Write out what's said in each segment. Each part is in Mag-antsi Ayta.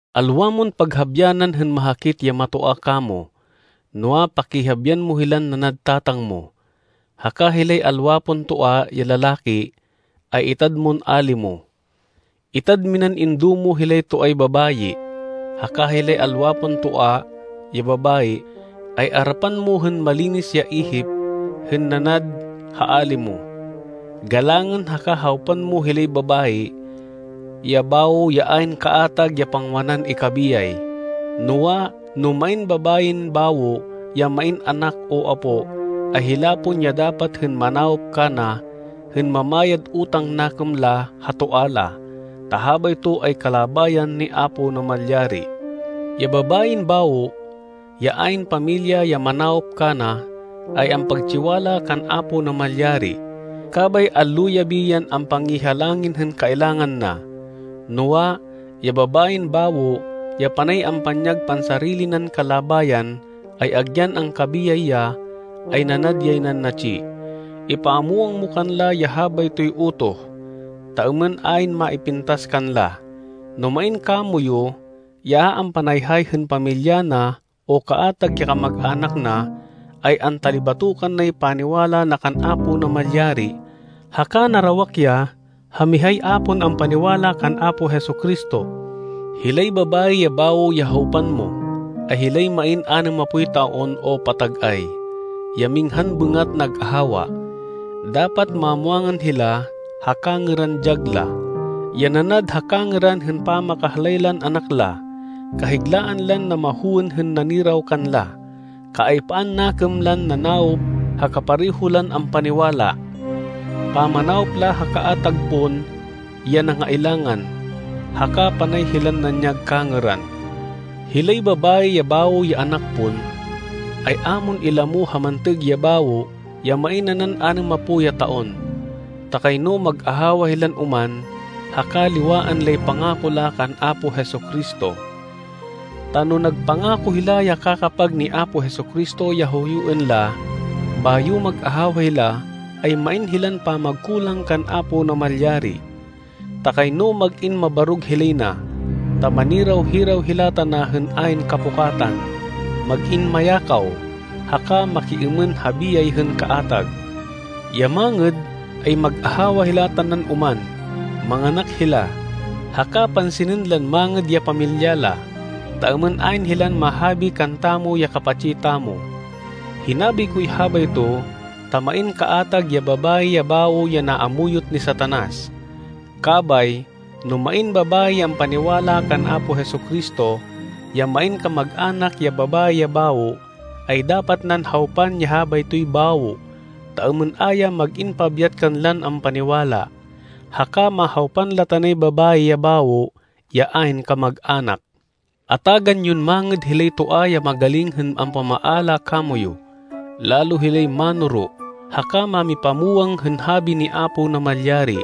Alwa mon paghabyanan hên mahakit ya matoa kamo. Noa, pakihabian mo hilan nanad tatang mo. Haka hilay alwa pon toa ya lalaki, ay itad mon ali mo. Itad minan indo mo hilay toay babayi, haka hilay alwa pon toa ya babayi, ay arapan mo hên malinis ya ihip hên nanad ha ali mo. Galangên haka hawpan mo hilay babayi ya bawo ya ayn kaatag ya pangwanan ikabiyay. Noa, no main babayin bawo ya main anak o apó, ay hila pon ya dapat hên manawop kana hên mamayad utang nakêm la ha toa la, ta habayto ay kalabayan ni Apo Namalyari. Ya babayin bawo, ya ayn pamilya ya manawop kana, ay ampagtsiwala kan Apo Namalyari, kabay allo-yabi yan ampangihalangin hên kailangan na. Noa, ya babayin bawo ya panay ampanyag pansarili nan kalabayan, ay agyan angkabiyay ya, ay nanad yay nan natsi. Ipamwang mo kanla ya habaytoy utoh, ta êmên ayn maipintas kanla. No main kamoyu ya a ampanayhay hên pamilya na o kaatag ya kamag-anak na, ay antalibatokan nay paniwala na kan Apo Namalyari, haka narawak ya ha mihay a pon ampaniwala kan Apo Jesu-Cristo. Hilay babayi ya bawo ya hawpan mo, ay hilay main anêmapoy taon o patag-ay, ya minghan bêngat nag-ahawa. Dapat mamwangan hila ha kangêran dyag la, ya nanad ha kangêran hên pamakahlay lan anak la, kahiglaan lan namahowên hên naniraw kanla, kaaypaan nakêm lan nanawop ha kapareho lan ampaniwala, pamanawop la ha kaatag pon ya nangailangan, haka panay hilan nanyag kangêran. Hilay babayi ya bawo ya anak pon, ay a mon ilamo ha mantêg ya bawo ya main nanan anêmapo ya taon, ta kayno mag-ahawa hilan oman haka liwaan lay pangako la kan Apo Jesu-Cristo. Ta no nagpangako hila ya kakapag ni Apo Jesu-Cristo ya huyuên la, bayo mag-ahawa hila, ay main hilan pamagkulang kan Apo Namalyari. Ta kayno mag-in mabarog hilay na. Ta maniraw-hiraw hila tana hên ayn kapukatan, mag-in mayakaw, haka makiêmên ha biyay hên kaatag. Ya mangêd, ay mag-ahawa hila tanan oman, manganak hila, haka pansinên lan mangêd ya pamilya la, ta êmên ayn hilan mahabi kantamo ya kapatsi tamo. Hinabi koy habayto ta main kaatag ya babayi ya bawo ya naamuyot ni Satanas. Kabay, no main babayi ya ampaniwala kan Apo Jesu-Cristo, ya main kamag-anak ya babayi ya bawo, ay dapat nan hawpan ya habaytoy bawo, ta êmên a ya mag-in pabyat kanlan ampaniwala, haka mahawpan la tanay babayi ya bawo ya ayn kamag-anak. Atagan yon mangêd hilay toa ya magaling hên ampamaala kamoyu, lalo hilay mánoro haka mámipamwang hên habi ni Apo Namalyari.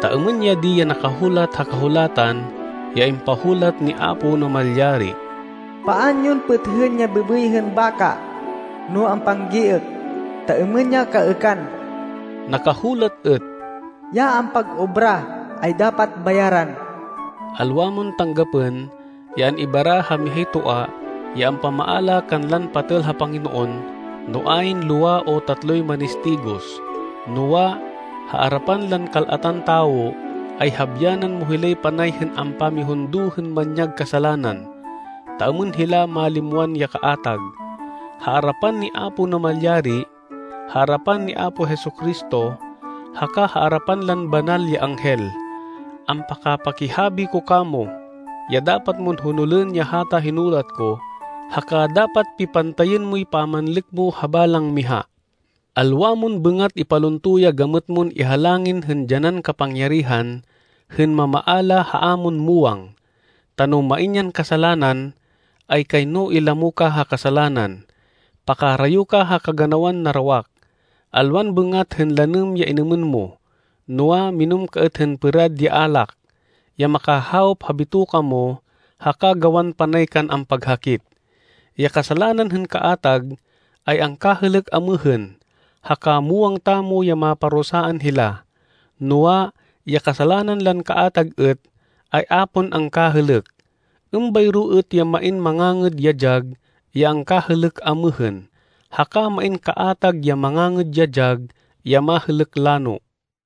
Ta êmên ya di ya nakahulat ha Kahulatan ya impahulat ni Apo Namalyari, “Paan yon pêthên ya bêbêy hên baka no ampanggiêk ta êmên ya kaêkan.” Nakahulat êt: “Ya ampag-obra, ay dapat bayaran.” Alwa mon tanggapên ya an-ibara ha mihay toa ya ampamaala kanlan patêl ha Panginoon no ayn lowa o tatloy manistigos. Noa, ha arapan lan kal-atan tawo, ay habyanan mo hilay panay hên ampamihundo hên manyag kasalanan, ta êmên hila malimwan ya kaatag. Ha arapan ni Apo Namalyari, ha arapan ni Apo Jesu-Cristo haka ha arapan lan banal ya anghel, ampakapakihabi ko kamo, ya dapat mon honolên ya hata hinulat ko, haka dapat pipantayên moy pamanlêk mo ha balang miha. Alwa mon bêngat ipalunto ya gamêt mon ihalangin hên dyanan kapangyarihan hên mamaala ha a mon muwang, ta no main yan kasalanan, ay kayno ilamo ka ha kasalanan. Pakarayo ka ha kaganawan narawak. Alwan bêngat hên lanêm ya inêmên mo, noa, minêm ka êt hên pêrad ya alak, ya makahawop ha bitoka mo haka gawan panay kan ampaghakit. Ya kasalanan hên kaatag, ay angkahêlêk amêhên, haka muwang tamo ya maparusaan hila, noa, ya kasalanan lan kaatag êt, ay a pon angkahêlêk. Êmbayro êt ya main mangangêd ya dyag ya angkahêlêk amêhên, haka main kaatag ya mangangêd ya dyag ya mahêlêk lano.